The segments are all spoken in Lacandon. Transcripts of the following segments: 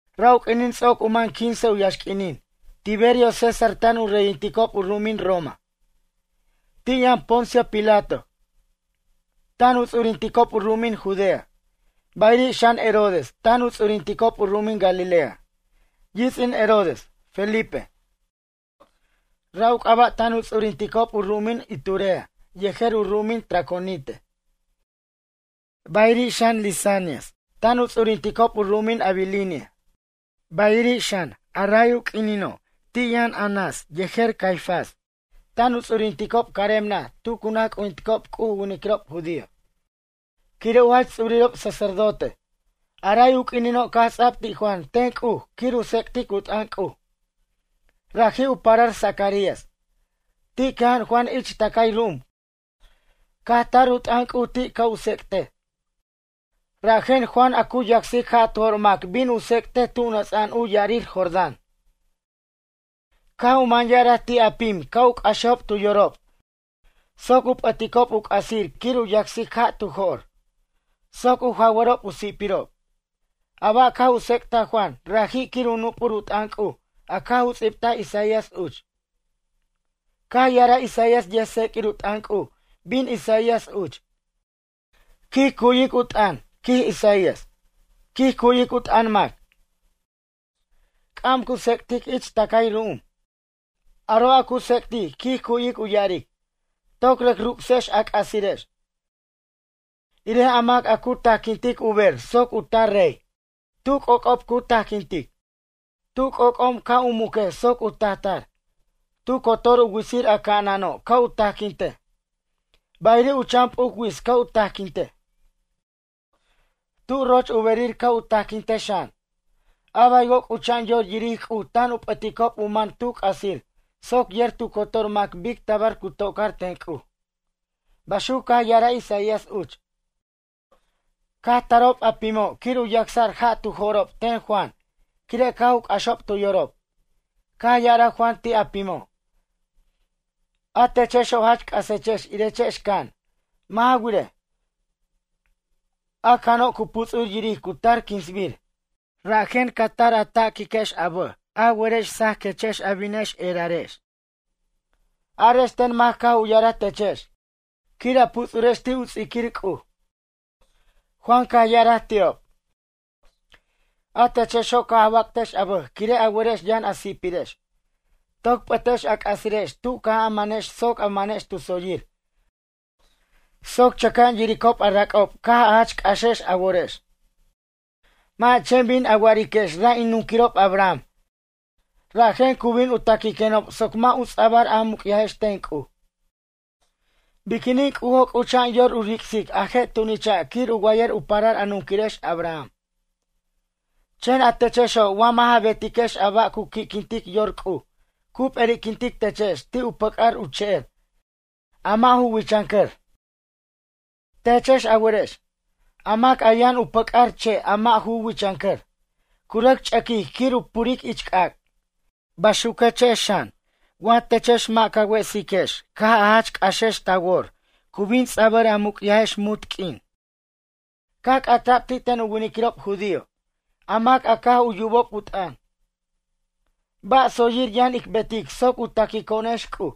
Ra' u q'uinin ts'oc u mʌn quince u yaxq'uinin Tiberio César tan u reyinticob u ru'umin Roma. Ti' yʌn Poncio Pilato tan u ts'urinticob u ru'umin Judea. Bayiri' xan Herodes tan u ts'urinticob u ru'umin Galilea. Yits'in Herodes, Felipe, ra' u c'aba' tan u ts'urinticob u ru'umin Iturea yejer u ru'umin Traconite. Bayiri' xan Lisanias tan u ts'urinticob u ru'umin Abilinia. Bayiri' xan a ray u q'uinino' ti' yʌn Anás yejer Caifás tan u ts'urinticob carem naj tu cu naj c'ujinticob C'uj u winiquirob judío. Quire' u jach ts'urirob sacerdote. A ray u q'uinino' caj ts'a'b ti' Juan ten C'uj quir u tsec'tic u t'ʌn C'uj. Raji' u parar Zacarías. Ti' cʌja'an Juan ich tʌcay ru'um caj tar u t'ʌn C'uj ti' ca' u tsec'tej. Rajen Juan a cu yacsic ja' tu jo'r mac bin u ts'ectej tu nʌts'a'an u ya'arir Jordán. Caj u man ya'araj ti' a pim ca' u c'axejob tu yorob soc u p'ʌticob u c'asir quir u yacsic ja' tu jo'r soc u jawʌrob u si'pirob. A ba' caj u tsec'taj Juan raji' quir u nup'ur u t'ʌn C'uj a caj u ts'ibtaj Isaías uch. Caj ya'araj Isaías yʌjtseq'uir u t'ʌn C'uj bin Isaías uch: Quij cu'yic u t'ʌn, quij Isaías. Quij cu'yic u t'ʌn mac, c'am cu tsec'tic ich tʌcay ru'um. Aro' a cu tsec'tic quij cu'yic u ya'aric: Toc rʌc ruc'sex a c'asirex, irej a mac cu tajquintic u ber soc u tar rey. Tu c'oc'ob cu tajquintic. Tu c'omc'om ca' u muquej soc u tajtar. Tu cotor u witsir a ca'anano' ca' u tajquintej, bayiri' u chan p'uc wits ca' u tajquintej. Tu roch u berir ca' u tajquintej xan. Abaywo' c'ucha'an yor yiric C'uj tan u p'ʌticob u man tu c'asir soc yer tu cotor mac bic tabar cu tocar ten C'uj. Baxuc caj ya'araj Isaías uch. Caj tarob a pimo' quir u yacsa'r ja' tu jo'rob ten Juan quire' caj u c'axob tu yorob. Caj ya'araj Juan ti' a pimo': ―A techexo' jach c'asechex irechex can. Mʌ' ja wirej, a cano' cu puts'ur yiric cu tar quinsbir. Rajen ca tar a taquiquex a bʌj a werex sajaquechex a binex erarex. Arex ten mac caj u ya'araj techex quir a puts'urex ti' u ts'iquir C'uj? Juan caj ya'araj ti'ob: ―A techexo' caj a wac'tex a bʌj quire' a werex yʌn a si'pirex. Toc p'ʌtex a c'asirex tu caj a manex soc a manex tu tsoyir soc chʌca'an yiricob a rac'ob caj a jach c'axex a worex. Mʌ' a chen bin a wa'ariquex ra' in nunquirob Abraham rajen cu bin taquiquenob soc mʌ' u ts'abʌr a muc'yajex ten C'uj. Biquinin C'ujo' c'ucha'an yor u ric'sic a je' tunicha' quir u wayʌr u parar a nunquirex Abraham. Chen a techexo' wa mʌ'ja betiquex a ba' cu qui'quintic yor C'uj cu p'eri'quintic techex ti' pʌc'ar u che'er a mʌ' ju wichʌncʌr. Techex a werex, a mac a yʌn u pʌc'ar che' a mʌ' ju wichʌncʌr, cu rʌc ch'ʌquic quir u puric ich c'ac'. Baxuquex xan wa techex mʌ' ca wesiquex caj a jach c'axex ta wor cu bin ts'abʌr a muc'yajex munt q'uin. Caj c'ata'b ti' ten u winiquirob judío, a mac a caj u yubob u t'ʌn: ―Ba' tsoyir yʌn ic betic soc u taquico'onex C'uj?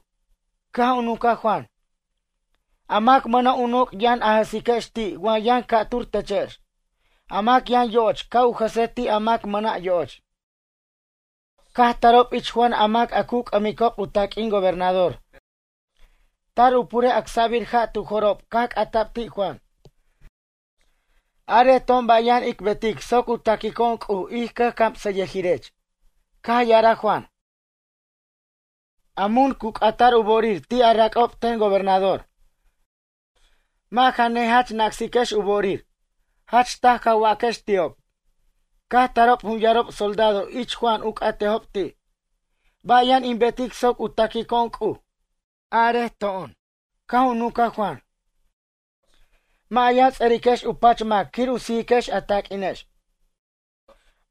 Caj u nunca Juan: ―A mac mʌna' u noc' yʌn a jʌsiquex ti' wa yʌn ca'tur techex. A mac yʌn yo'och ca' u jʌsej ti' a mac mʌna' yo'och. Caj tarob ich Juan a mac a cu c'ʌmicob u taq'uin gobernador tar u purej acsabir ja' tu jo'rob caj c'ata'b ti' Juan: ―Arej to'on ba' yʌn ic betic soc u taquico'on C'uj ij cʌjcamsʌyʌjirech. Caj ya'araj Juan: ―A mun cu c'ata'r u bo'orir ti a rac'ob ten gobernador. Mʌ' ja ne jach nacsiquex u bo'orir. Jach taj ca waquex ti'ob. Caj tarob jun yarob soldado ich Juan u c'atejob ti': ―Ba' yʌn ic betic soc u taquico'on C'uj, arej to'on. Caj u nunca Juan: ―Mʌ' a yʌn ts'ʌriquex u pach mac quir u sijiquex a taq'uinex.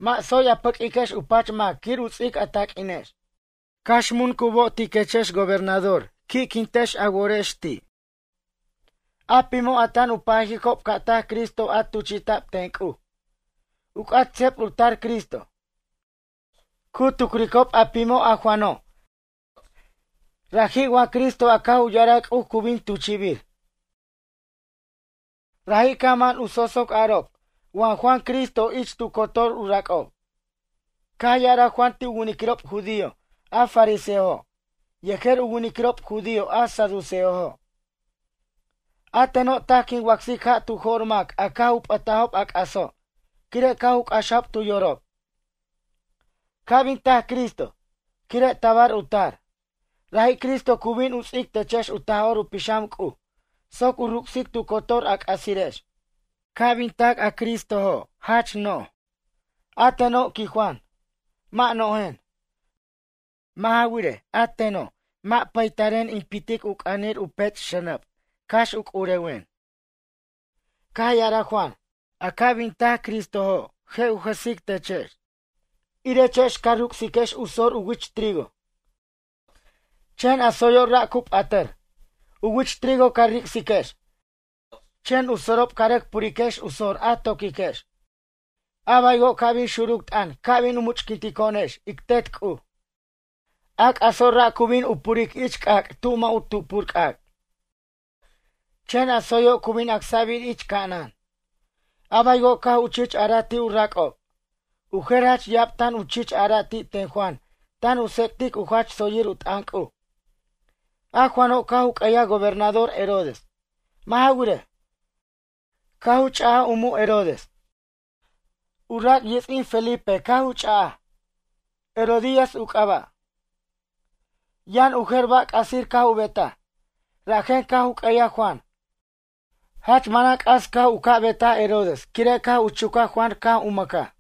Mʌ' tsoy a pʌq'uiquex u pach mac quir u ts'ic a taq'uinex. Cax mun cu bo'otiquechex gobernador qui'quintex a worex ti'. A pimo' a tan u pajicob ca' tac Cristo a tuchi'ta'b ten C'uj, u c'at seb u tar Cristo. Cu tucricob a pimo' a Juano', raji' wa Cristo a caj u ya'araj C'uj cu bin tuchi'bir. Raji' caj man u tsotsoc arob wa Juan Cristo ich tu cotor u rac'ob. Caj ya'araj Juan ti' u winiquirob judío a fariseojo' yejer u winiquirob judío a saduceojo': ―A teno' taj quin wacsic ja' tu jo'r mac a caj u p'ʌtajob a c'aso' quire' caj u c'axajob tu yorob. Ca' bin tac Cristo, quire' tabar u tar, raji' Cristo cu bin u ts'ic techex u Taj'or u Pixam C'uj soc u ruc'sic tu cotor a c'asirex. Ca' bin tac a Cristojo' jach no'j. A teno' ―quij Juan―, mʌ' no'jen. Mʌ' ja wirej, a teno' mʌ' pataren in pitic u c'anir u pech' xʌnʌb cax u c'urewen. Caj ya'araj Juan: ―A ca' bin tac Cristojo' je' u jʌsic techex, irechex ca ruc'siquex u sor u wich trigo. Chen a tsoyo' ra' cu p'atʌr. U wich trigo ca ric'siquex, chen u sorob ca rʌc puriquex u sor a toquiquex. A baywo' ca' bin xuruc t'ʌn ca' bin u much'quintico'onex ic Tet C'uj, a c'aso' ra' cu bin u puric ich c'ac' tu mʌ' u tupur c'ac'. Chen a tsoyo' cu bin acsa'bir ich ca'anan. A baywo' caj u chich araj ti' u rac'ob. U jer jach ya'ab tan u chich ara' ti' ten Juan tan u tsec'tic u jach tsoyir u t'ʌn C'uj. A Juano' caj u q'ueyaj gobernador Herodes. Mʌ' ja wirej, caj u ch'a'aj u mu' Herodes. U rac' yits'in Felipe caj u ch'aj, Herodías u c'aba'. Yʌn u jer ba' c'asir caj u betaj, rajen caj u q'ueyaj Juan. Jach manan c'as caj u ca' betaj Herodes quire' caj u chuca Juan caj u mʌcaj.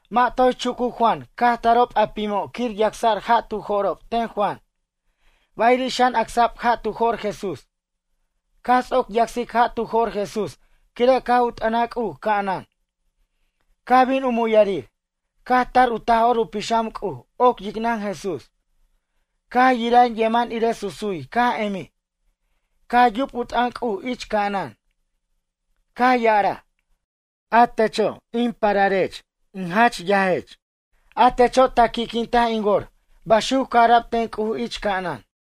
Mʌ' toy chucuc Juan caj tarob a pimo' quir yacsa'r ja' tu jo'rob ten Juan, bayiri' xan acsa'b ja' tu jo'r Jesús. Caj ts'oc yacsic ja' tu jo'r Jesús quire' caj u t'ʌnaj C'uj ca'anan. Caj bin u muyarir. Caj tar u Taj'or u Pixam C'uj oc yicnʌn Jesús. Caj yira yeman irej susuy caj emij. Caj yub u t'ʌn C'uj ich ca'anan. Caj ya'araj: ―A techo' a chen in pararech, in jach yaj. Atecho' ta qui'quintaj in wor ―baxuc caj ara'b ten C'uj ich ca'anan.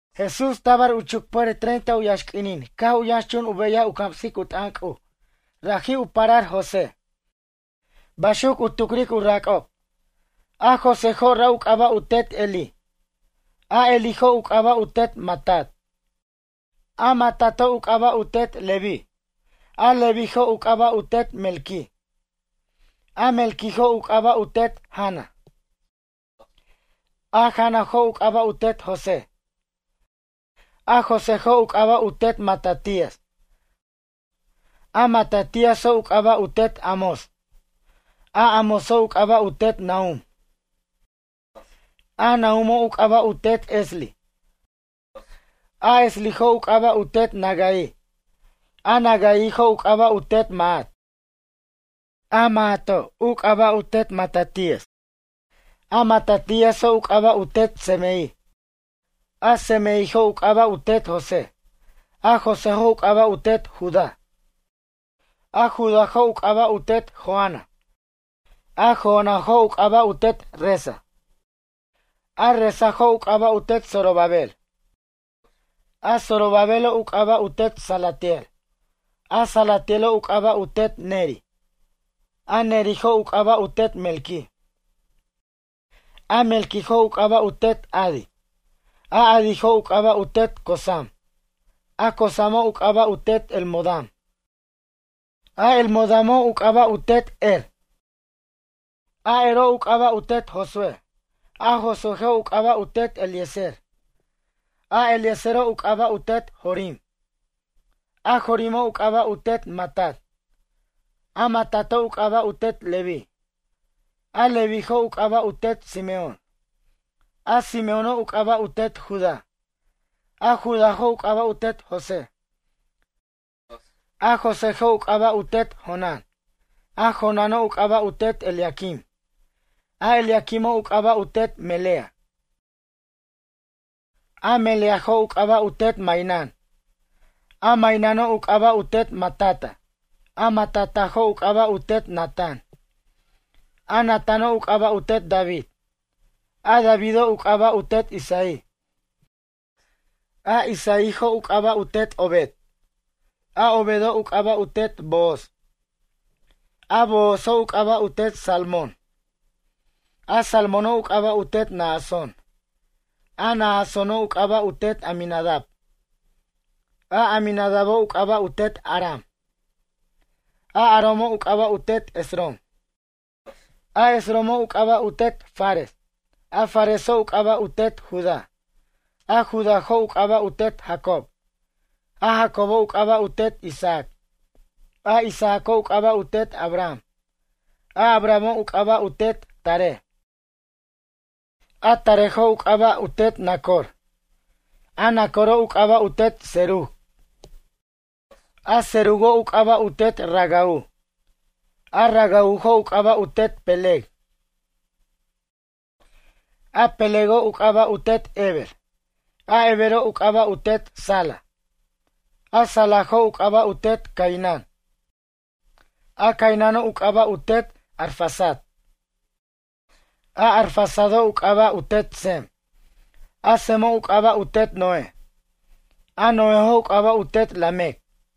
Jesús tabar u chucpʌjʌr treinta u yaxq'uinin caj u yʌnxchun u beyaj u camsic u t'ʌn C'uj. Raji' u parar José, baxuc u tucric u rac'ob. A Joséjo' ra' u c'aba' u tet Elí. A Elíjo' u c'aba' u tet Matat. A Matato' u c'aba' u tet Leví. A Levíjo' u c'aba' u tet Melqui. A Melquijo' u c'aba' u tet Jana. A Janajo' u c'aba' u tet José. A Joséjo' u c'aba' u tet Matatías. A Matatíaso' u c'aba' u tet Amós. A Amóso' u c'aba' u tet Nahum. A Nahumo' u c'aba' u tet Esli. A Eslijo' u c'aba' u tet Nagai. A Nagaijo' u c'aba' u tet Maat. A Maato' u c'aba' u tet Matatías. A Matatíaso' u c'aba' u tet Semei. A Semeijo' u c'aba' u tet José. A Joséjo' u c'aba' u tet Judá. A Judájo' u c'aba' u tet Joana. A Joanajo' u c'aba' u tet Resa. A Resajo' u c'aba' u tet Zorobabel. A Zorobabelo' u c'aba' u tet Salatiel. A Salatielo' u c'aba' u tet Neri. A Nerijo' u c'aba' u tet Melqui. A Melquijo' u c'aba' u tet Adi. A Adijo' u c'aba' u tet Cosam. A Cosamo' u c'aba' u tet Elmodam. A Elmodamoj u c'aba' u tet Er. A Ero' u c'aba' u tet Josúe. A Josuéjo' u c'aba' u tet Eliezer. A Eliezero' u c'aba' u tet Jorim. A Jorimo' u c'aba' u tet Matat. A Matato' u c'aba' u tet Leví. A Levíjo' u c'aba' u tet Simeón. A Simeóno' u c'aba' u tet Judá. A Judájo' u c'aba' u tet José. A Joséjo' u c'aba' u tet Jonán. A Jonáno' u c'aba' u tet Eliaquim. A Eliaquimo' u c'aba' u tet Melea. Meleajo' u c'aba' u tet Mainán. A Maináno' u c'aba' u tet Matata. A Matatajo' u c'aba' u tet Natán. A Natáno' u c'aba' u tet David. A Davido' u c'aba' u tet Isaí. A Isaíjo' u c'aba' u tet Obed. A Obedo' u c'aba' u tet Booz. A Boozo' u c'aba' u tet Salmón. A Salmóno' u c'aba' u tet Naasón. A Naasóno' u c'aba' u tet Aminadab. A Aminadabo' u c'aba' u tet Aram. A Aramo' u c'aba' u tet Esrom. A Esromo' u c'aba' u tet Fares. A Fareso' u c'aba' u tet Judá. A Judájo' u c'aba' u tet Jacob. A Jacobo' u c'aba' u tet Isaac. A Isaaco' u c'aba' u tet Abraham. A Abrahamo' u c'aba' u tet Taré. A Taréjo' u c'aba' u tet Nacor. A Nacoro' u c'aba' u tet Serug. A Serugo' u c'aba' u tet Ragau. A Ragaujo' u c'aba' u tet Peleg. A Pelego' u c'aba' u Tet Heber. A Hebero' u c'aba' u tet Sala. A Salajo' u c'aba' u tet Cainán. A Caináno' u c'aba' u tet Arfaxad. A Arfaxado' u c'aba' u tet Sem. A Semo' u c'aba' u tet Noé. A Noéjo' u c'aba' u tet Lamec.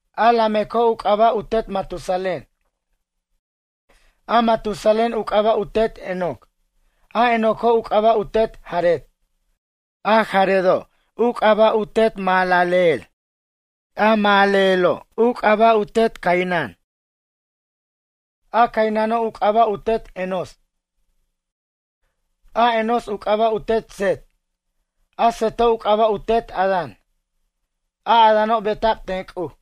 A Lameco' u c'aba' u tet Matusalén. A Matusalén u c'aba' u tet Enoc. A Enoco' u c'aba' u tet Jared. A Jaredo' u c'aba' u tet Mahalaleel. A Mahalaleelo' u c'aba' u tet Cainán. A Caináno' u c'aba' u tet Enós. A Enós u c'aba' u tet Set. A Seto' u c'aba' u tet Adán. A Adáno' beta'b ten C'uj.